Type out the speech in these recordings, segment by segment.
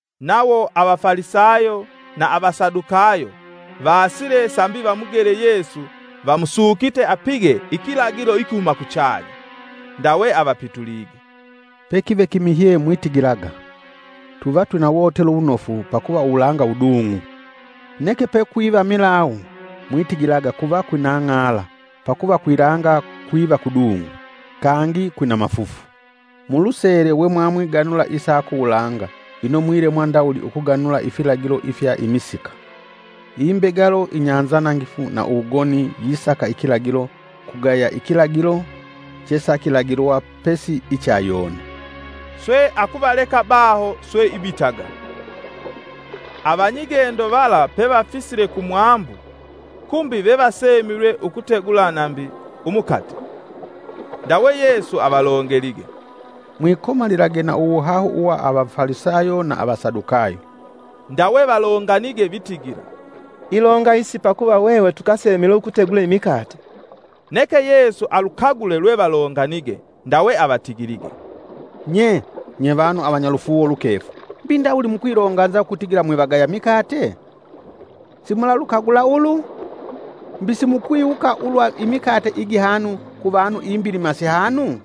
Nawo Avafalisayo na Avasadukayo vaasile sambi vamugele Yesu vamusukite apige ikilagilo ikihuma kuchanya. Ndawe avapitulige, “Pekive kimihye mwitigilaga: ‘Tuvatwina wotelo wunofu pakuva uwulanga wudung'u!’ Neke pekwiva milawu mwitigilaga kuva kwina ng'ala, pakuva kwilanga kwiva kudung'u kangi kwina mafufu; mulusele we mwamwiganula isa kuwulanga ino mwilemwa ndawuli ukuganula ifilagilo ifya imisika. Imbegalo inyanzanangifu na uwugoni yisaka ikilagilo kugaya ikilagilo; chesakilagilwa pesi icha Yona.” Swe akuvaleka baho swe ibitaga. Avanyigendo vala pevafisile kumwambu, kumbi vevasemilwe ukutegula nambi umukate. Ndawe Yesu avalongelige, “Mwikomalilage na uwuhahu uwa Avafalisayo na Avasadukayo.” Ndawe valonganige vitigila, “Ilonga isi pakuva hwehwe tukasemilwe ukutegula imikate.” Neke Yesu alukagule lwe valonganige ndawe avatigilige, “Nye! Nyevanu avanyalufuuwo lukefu! Mbi ndawuli mukwilonganza ukutigila mwivagaya mikate? Simulalukagula ulu? Mbi simukwiwuka ulwa imikate igihanu kuvanu imbilima sihanu?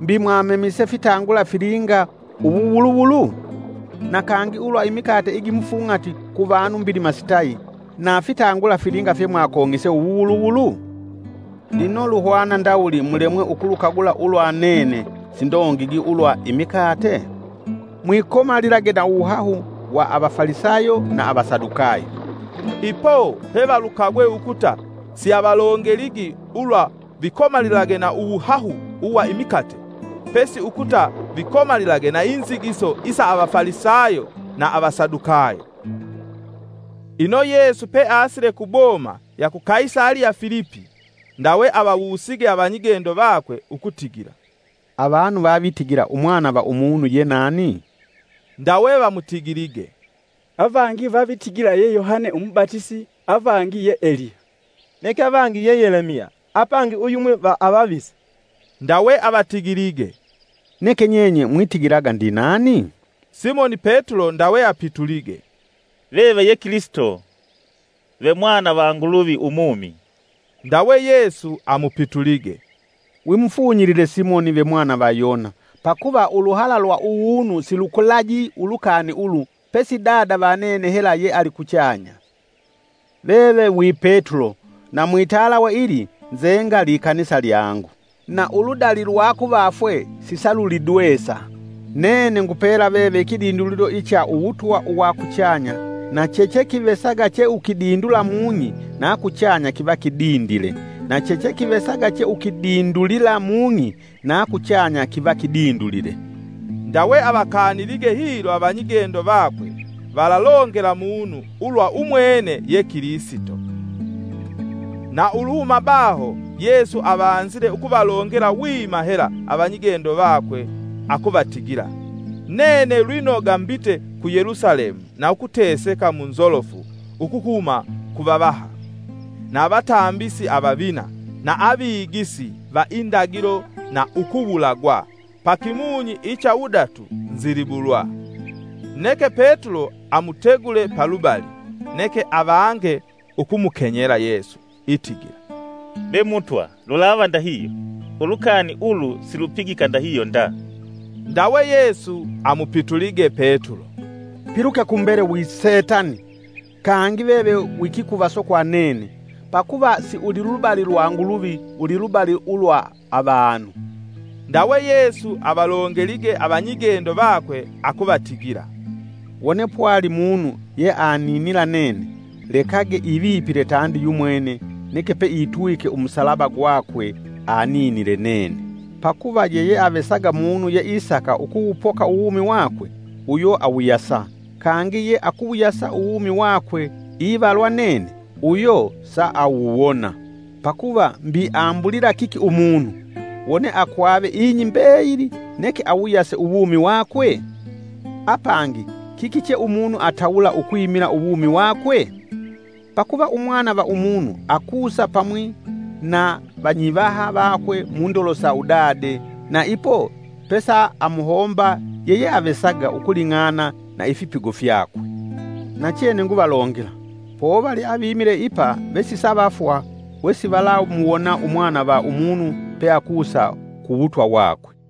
Mbi mwamemise fitangula filinga uwuwuluwulu? Na kangi ulwa imikate igimufung'ati ku vanu mbilima sitayi, na fitangula filinga fyemwakong'ise uwuwuluwulu? Lino luhwana ndawuli mulemwe ukulukagula ulwa nene sindongigi ulwa imikate? Mwikomalilage na uwuhahu wa Avafalisayo na Avasadukayo!” Ipo pevalukagwe ukuta siavalongeligi ulwa vikomalilage na uwuhahu uwa imikate, pesi ukuta vikomalilage na inzigiso isa Avafalisayo na Avasadukayo. Ino Yesu peasile kuboma ya ku Kaisaliya Filipi, ndawe avawusige avanyigendo vakwe ukutigila, “Avanu vavitigila Umwana va Umunu ye nani?” Ndawe vamutigilige, “Avangi vavitigila ye Yohane umubatisi, avangi ye Eliya, neke avangi ye Yelemiya apangi uyumwi va avavisi.” Ndawe avatigilige, “Neke nyenye mwitigilaga ndinani?” Simoni Petulo ndawe apitulige, “Veve ye Kilisito, vemwana va Nguluvi umumi.” Ndawe Yesu amupitulige, “Wimufunyilile Simoni ve mwana va Yona, pakuva uluhala lwa uwunu silukulaji ulukani ulu pesi Dada va nene hela yealikuchanya. Veve wi Petulo na mwitalawe ili nzenga likanisa lyangu, na uludali lwa kuvafwe sisalulidwesa. Nene ngupela veve ikidindulilo icha uwutwa uwa kuchanya, na chechekivesaga cheukidindula mung'i na kuchanya kiva kidindile na chechekivesaga cheukidindulila mung'i na kuchanya kiva kidindulile.” Ndawe avakanilige hilo avanyigendo vakwe valalongela munu ulwa umwene ye Kilisito. Na uluhuma baho Yesu avanzile ukuvalongela wima hela avanyigendo vakwe akuvatigila, “Nene lwinoga mbita ku Yelusalemu na ukuteseka mu nzolofu ukuhuma ku vavaha, na avatambisi avavina, na avigisi va indagilo na ukuwulagwa, pakimunyi icha wudatu nzilibulwa.” Neke Petulo amutegule palubali, neke avange ukumukenyela Yesu itigila: “Be Mutwa lulava ndahihyo! Ulukani ulu silupigika ndahihyo nda.” Ndawe Yesu amupitulige Petulo, “Piluke kumbele wi Setani! Kangi veve wi kikuvaso kwa nene; pakuva si ulilubali lwa Nguluvi, ulilubali ulwa avanu.” Ndawe Yesu avalongelige avanyigendo vakwe akuvatigila, “Wone pwali munu yeaninila nene, lekage ivipile tandi yumwene neke peitwike umusalaba gwakwe aninile nene. Pakuva yeyeavesaga munu yeisaka ukuwupoka uwumi wakwe uyo awuyasa, kangi ye akuwuyasa uwumi wakwe ivalwa nene uyo saawuwona. Pakuva mbi ambulila kiki umunu, wone akwave ing'i mbeyili neke awuyase uwumi wakwe? Apangi kiki che umunu atawula ukwimila uwumi wakwe? Pakuva Umwana va Umunu akusa pamwi na vanyivaha vakwe mundolo sa udade. Na ipo pesaamuhomba yeyeavesaga ukuling'ana na ifipigo fyakwe. Nachene nguvalongela, povali avimile ipa vesisavafwa wesivalamuwona Umwana va Umunu peakusa ku wutwa wakwe.”